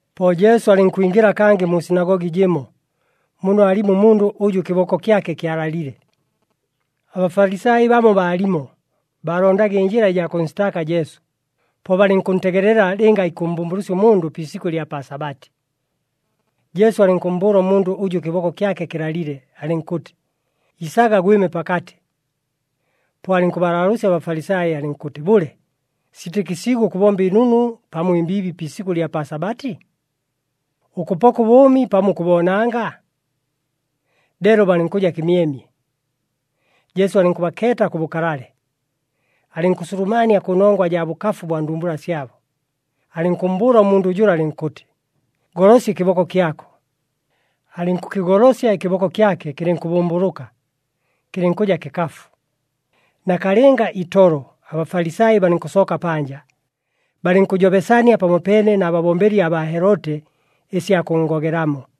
Po Jesu alɨnkwingɨla kangɨ mu sinagogi jɨmo, muno aalimo ʉmundʉ ʉjʉ ɨkɨboko kyake kyalalile. ABafalisai bamo baalimo, baalondaga ɨnjɨla ɨjaa kʉnsitaaka Jesu, po balɨnkʉntegelela lɨnga ikʉmmbʉmbʉlʉsya ʉmundʉ pi isikʉ ɨlya pa Sabati. Jesu alɨnkʉmmbʉʉla ʉmundʉ ʉjʉ ɨkɨboko kyake kɨlalile, alɨnkʉtɨ, “Isaga, gwɨme pakatɨ.” Po alɨnkʉbalaalʉʉsya aBafalisai, alɨnkʉtɨ, “Bʉle, siitɨkɨsiigwe ʉkʉbomba ɨnunu pamo ɨmbiibi pi isikʉ ɨlya pa Sabati? Ʉkʉpoka ʉbʉʉmi pamo ʉkʉboonanga?” Leelo balɨnkʉja kɨmyemye. Jesu alɨnkʉbakeeta kʉ bʉkalale, alɨnkʉsulumania kʉnongwa jaa bʉkafu bwa ndumbula syabo. Alɨnkʉmmbʉʉla ʉmundʉ jʉla, alɨnkʉtɨ, “Golosya ɨkɨboko kyako.” Alɨnkʉkɨgolosya ɨkɨboko kyake, kɨlɨnkʉbʉmbʉlʉka, kɨlɨnkʉja kɨkafu. Nakalɨnga itolo aBafalisai balɨnkʉsooka panja, balɨnkʉjobesania pamopeene na babombeli abaa Heloti ɨsya kʉnngogelamo.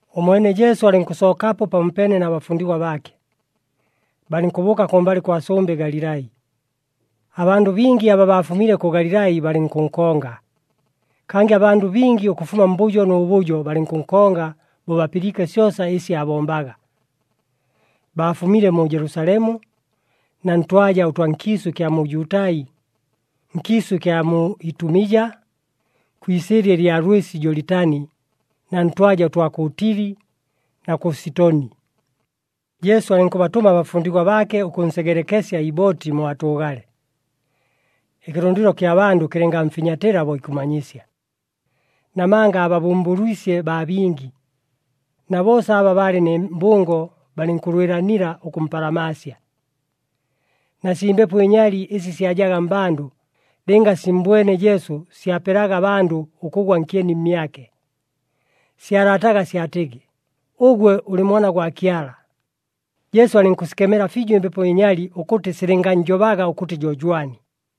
Ʉmwene Jesu alɨnkʉsookapo pamopeene na bafundigwa baake, balɨnkʉbʉʉka kʉmbalɨ kwa sʉmbɨ Galilai. Abandʉ bingi aba baafumile kʉ Galilai balɨnkʉnkonga. Kangɨ abandʉ bingi ʉkʉfuma mbʉjo nʉ bʉjo balɨnkʉnkonga bo bapɨliike syosa ɨsi aabombaga. Baafumile mu Jelusalemu na ntwaja ʉtwa nkiisʉ ɨkya mu Jutai, nkiisʉ ɨkya mu Itumija, kwi isɨɨlya ɨlya lwɨsi Jolitani na ntwaja ʉtwa kʉ Tili na kʉ Sitoni. Jesu alɨnkʉbatʉma abafundigwa baake ʉkʉnsegelekesya ibooti mo atʉʉgale, ɨkɨlʉndɨlo kya bandʉ kɨlɨngamfinyatɨla bo ikʉmanyisya. Namanga aababʉmbʉlwisye baa bingi, na boosa aba baalɨ nɨ mbʉngo balɨnkʉlwɨlanila ʉkʉmpalamaasya. Na sii mbepo ɨnyali ɨsi syajaga mmbandʉ, lɨnga simmbwene Jesu syapelaga abandʉ ʉkʉgwa nkyeni mmyake. Syalataga syatɨgɨ, “Ʉgwe ʉlɨ Mwana gwa Kyala.” Jesu alɨnkʉsikemela fiijo ɨmbepo ɨnyali ʉkʉtɨ silɨngannjobaga ʉkʉtɨ jo jwani.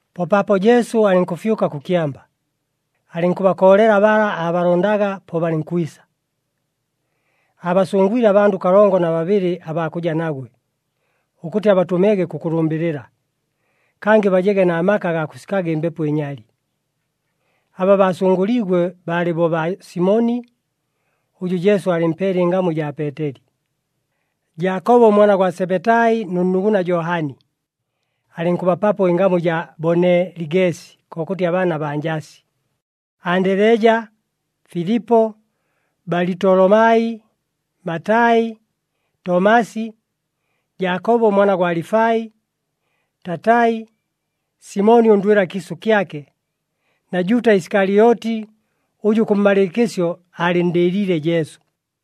Po paapo Jesu alɨnkʉfyʉka kʉ kyamba, alɨnkʉbakoolela bala aabalondaga, po balɨnkwisa. Aabasʉngwile abandʉ kalongo na babɨlɨ abaa kʉja nagwe, ʉkʉtɨ abatʉmege kʉkʉlʉmbɨlɨla, kangɨ bajege na maka agaa kʉsikaga ɨmbepo ɨnyali. Aba baasʉngʉliigwe baalɨ bo baa Simoni (ʉjʉ Jesu aalɨmpeele ɨngamu ɨjaa Peeteli), Jaakobo ʉmwana gwa Sebetai nʉ nnuguna Johani (alɨnkʉbapapo ɨngamu ɨjaa Boneligesi, kokʉtɨ abaana baa njasi), Andeleja, Filipo, Balitolomai, Matai, Tomasi, Jaakobo ʉmwana gwa Alifai, Tatai, Simoni ʉndwɨla kiisʉ kyake, na Juuta Isikalyoti ʉjʉ kʉmmalɨɨkɨsyo aalɨnndɨɨliile Jesu.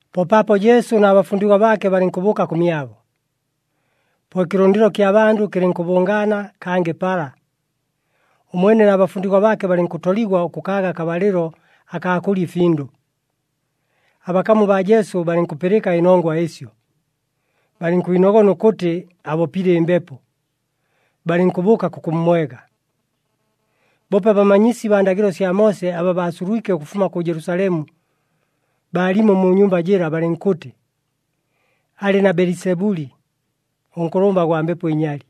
Po paapo Jesu na bafundigwa baake balɨnkʉbʉʉka kʉmyabo. Po ɨkɨlʉndɨlo kya bandʉ kɨlɨnkʉbʉngaana kangɨ pala, ʉmwene na bafundigwa baake balɨnkʉtoligwa ʉkʉkaaga akabalɨlo akaa kʉlya ɨfindʉ. Abakamu baa Jesu balɨnkʉpɨlɨka ɨnongwa ɨsyo, balɨnkwinogona ʉkʉtɨ abopile ɨmbepo, balɨnkʉbʉʉka kʉkʉmmwega. Boope abamanyisi baa ndagɨlo sya Moose aba baasulwike ʉkʉfuma kʉ Jelusalemu, baalimo mu nyumba jɨla, balɨnkʉtɨ, “Alɨ na Belisebuli, ʉnkʉlʉmba gwa mbepo ɨnyali!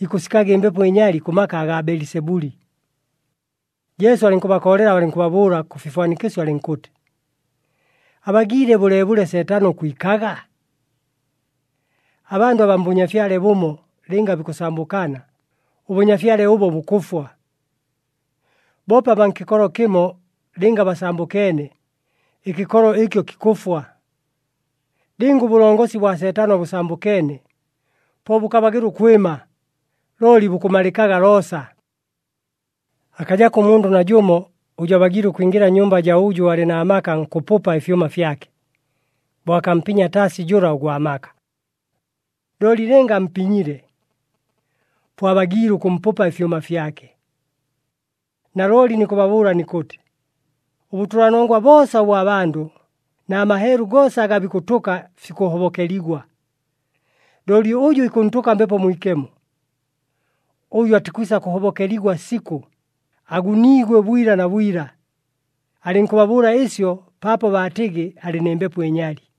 Ikʉsikaga ɨmbepo ɨnyali kʉ maka agaa Belisebuli.” Jesu alɨnkʉbakoolela, alɨnkʉbabʉʉla kʉ fifwanikɨsyo, alɨnkʉtɨ, “Abagiile bʉleebʉle Seetano ʉkwikaga? Abandʉ abaa mbʉnyafyale bʉmo, lɨnga bikʉsambʉkana, ʉbʉnyafyale ʉbo bukʉfwa. Boope abaa nkɨkolo kɨmo, lɨnga basambʉkeene, ɨkɨkolo ɨkyo kikʉfwa. Lɨnga ʉbʉlongosi bwa Seetano bʉsambʉkeene, po bʉkabagɨla ʉkwɨma, looli bukʉmalɨkaga loosa. Akajako ʉmundʉ najʉmo ʉjʉ abagiile ʉkwingɨla nnyumba jaa ʉjʉ alɨ na maka nkʉpʉpa ɨfyʉma fyake, bo akampinya taasi jʉla ʉgwa maka. Looli lɨnga ampinyile, po abagiile ʉkʉmpʉpa ɨfyʉma fyake. “Nalooli nikʉbabʉʉla nikʉtɨ, ʉbʉtʉlanongwa boosa ʉbwa bandʉ, na maheelu goosa aga bikʉtʉka fikʉhobokeligwa, looli ʉjʉ ikʉntʉka Mbepo Mwikemo, ʉjo atikwisa kʉhobokeligwa sikʉ, aguniigwe bwila na bwila.” Alɨnkʉbabʉʉla ɨsyo paapo baatɨgɨ alɨ nɨ mbepo ɨnyali.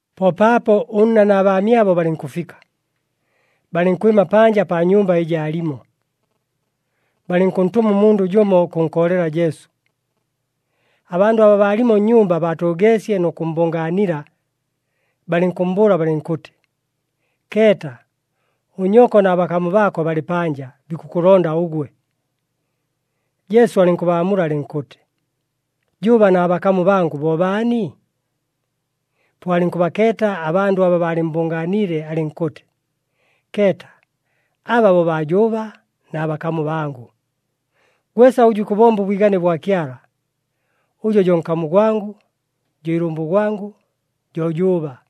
Po paapo ʉnna na baamyabo balɨnkʉfika, balɨnkwɨma panja pa nyumba ɨjɨ aalimo, balɨnkʉntʉma ʉmundʉ jʉmo ʉkʉnkoolela Jesu. Abandʉ aba baalimo nnyumba baatʉʉgeesye nʉ kʉmmbʉngaanila, balɨnkʉmmbʉʉla balɨnkʉtɨ, “Keeta! Ʉnyoko na bakamu baako balɨ panja, bikʉkʉlonda ʉgwe.” Jesu alɨnkʉbaamula alɨnkʉtɨ, “Jʉʉba na bakamu bangʉ bo baani?” Po alɨnkʉbakeeta abandʉ aba baalɨmmbʉngaaniile, alɨnkʉtɨ, “Keeta, aba bo baa jʉʉba na bakamu bangʉ! Gwesa ʉjʉ ikʉbomba ʉbwigane bwa Kyala, ʉjo jo nkamu gwangʉ, jo ilʉmbʉ gwangʉ, jo jʉʉba.”